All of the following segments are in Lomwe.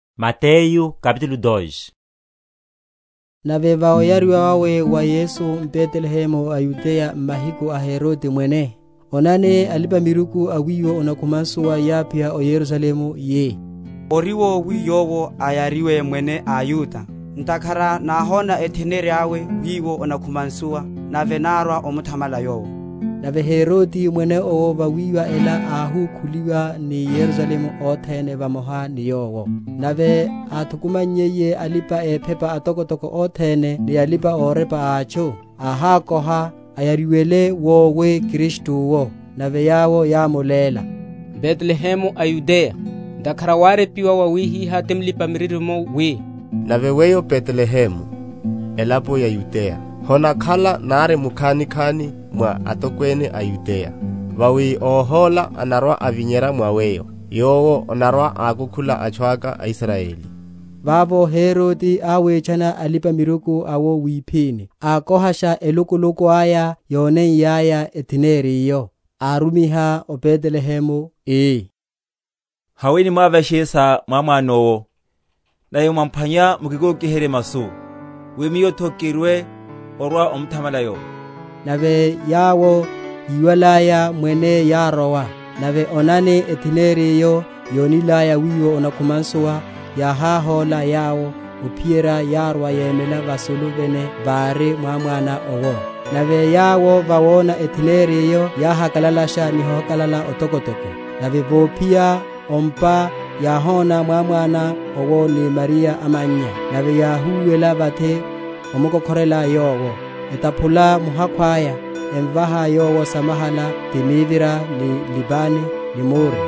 Alipa‐miruku a wiwo onakhuma nsuwa. Nave va ovariwa wawe wa Yesu m’Betelehemu a Yudeya m’mahiku a Herode mwene, onani, alipa‐miruku a wiwo onakhuwa nsuwa yáphiya o Yerusalemu, yi, Ori wowi yowo ayariwe Mwene a a Yuda? ntakhara náhona etheneri yawe wiwo onakhuma nsuwa, nave nárwa omuthamala Yowo. Nave Herode mwene owo vawiwa ela áhukhuliwa, ni Yerusalemu othene vamoha ni yowo. Nave áthukumannyiye alipa‐ephepa atokotoko othene ni alipa‐orepa a atchu, áhákoha, Ayariwele wowi Kristu’wo? Nave yawo yámuléla, M’Betelehemu a Yudeya: ntakhara wárepiwa wawihiha ti mulipa‐miririmo, wi, Nave weyo Betelehemu, elapo ya Yudeya, Honakhala nari mukhanikhani mwa atokwene a Yudeya, Vawi Óhola anarwa‐avinyerya mwa weyo, Yowo anarwa‐akukhula atchu aka aIsrayeli. Vavo Herode áwitchana Alipa‐miruku awo wiphini, ákohasha elukuluku aya yóneiyaya etheneri’yo. Arumiha o Betelehemu, ii, Haweni mwavyashe sa mwámwana owo; nave mwamphwanya, mukikokiherye masu, wi miyo’tho kirwe orwa‐omuthamala yowo. Nave yawo, yíwalaya mwene yárowa; nave onani, etheneri’yo yónilaya wiwo onakhuma nsuwa, yáhahóla yawo, ophiyerya yárwa yemela vasulu vene vari mwámwana owo. Nave yawo vawona etheneri’yo, yáhakalalasha ni ohakalala otokotoko. Nave vophiya o ’mpa yáhona mwámwana owo ni Mariya amannya, nave yáhúwela vathi omukokhorela yowo; etaphula muhakhu aya, emvaha yowo samahala, ti mivira ni libane ni mure.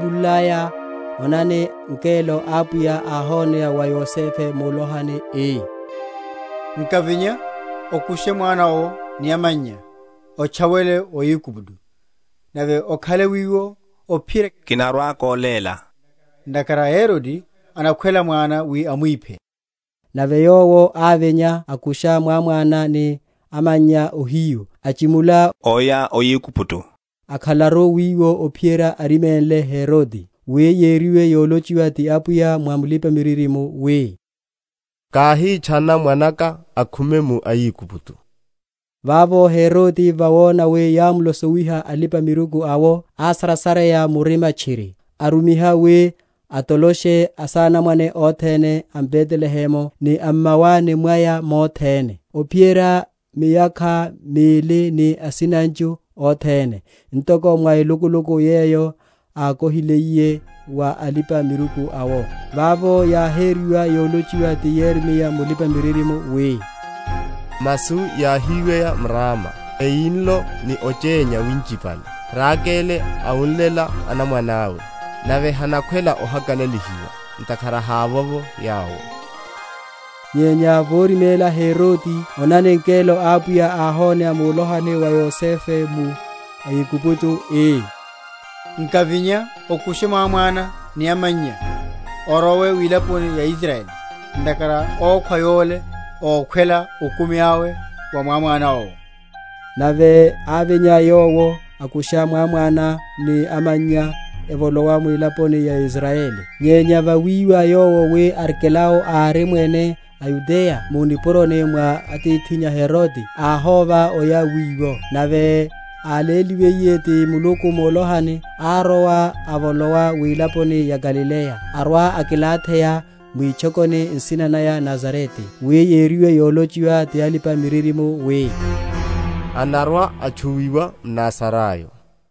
Nave yawo yáchimunlaya, onani, ngelo a Apwiya áhoneya wa Yosefe mulohani, ii, Nkavinya, okushe mwana owo ni amannya, otchawele o Aigupto, nave okhale wiwo ophiyerya kinarwa‐koléla; ntakhara Herode anakhwela mwana wi amwiphe. Nave yowo ávinya, akusha mwámwana ni amannya ohiyu, achimula oya o Aigupto; akhalaru wiwo ophiyerya árimenliye Herode: wi yériwe yólochiwa ti Apwiya mwa mulipa‐miririmo wi, Káhitchana mwanaka akhume mu Aigupto. Vavo Herode, vawona wi yámlosowiha alipa‐miruku awo, ásarasareya murima tchiri, arumiha wi átoloshe asanamwane othene a m’Betelehemu, ni a m’mawani mwaya mothene, óphiyerya miyakha mili ni asinanchu othene, ntoko mwa elukuluku yeyo ákohiliye wa Alipa‐miruku awo. Vavo yáheriwa yolochiwa ti Yeremiya mulipa‐miririmo, wi, Masu yahiweya m’Rama, Eyinlo ni ochénya winchipale, Rakele awunlela anamwane awe; Nave hanakhwela ohakalalihiwa, Ntakhara hávovo yawo. Okóka o Aigupto. Nyenya vórimela Herode, onani, ngelo a Apwiya áhoneya mulohani wa Yosefe mu Aigupto, ii, Nkavinya, okushe mwámwana ni amannya, orowe wilaponi ya Israyeli: ntakhara ókhwa yole ókhwela okumi awe wa mwámwana owo. Nave ávinya yowo, akusha mwámwana ni amannya evolowa mwilaponi ya Israyeli. Nyenya vawiwa yowo wi Arkelao ári mwene a Yudeya mu nipuroni mwa atithinnya Herode, áhova oya wiwo; nave áléliwiye ti Muluku mulohani, árowa avolowa wilaponi ya Galileya, arwa akilatheya mwitchokoni nsina naya Nazarete: wi yériwe yolochiwa ti alipa‐miririmo, wi, Anarwa‐atchuwiwa mNazarayo.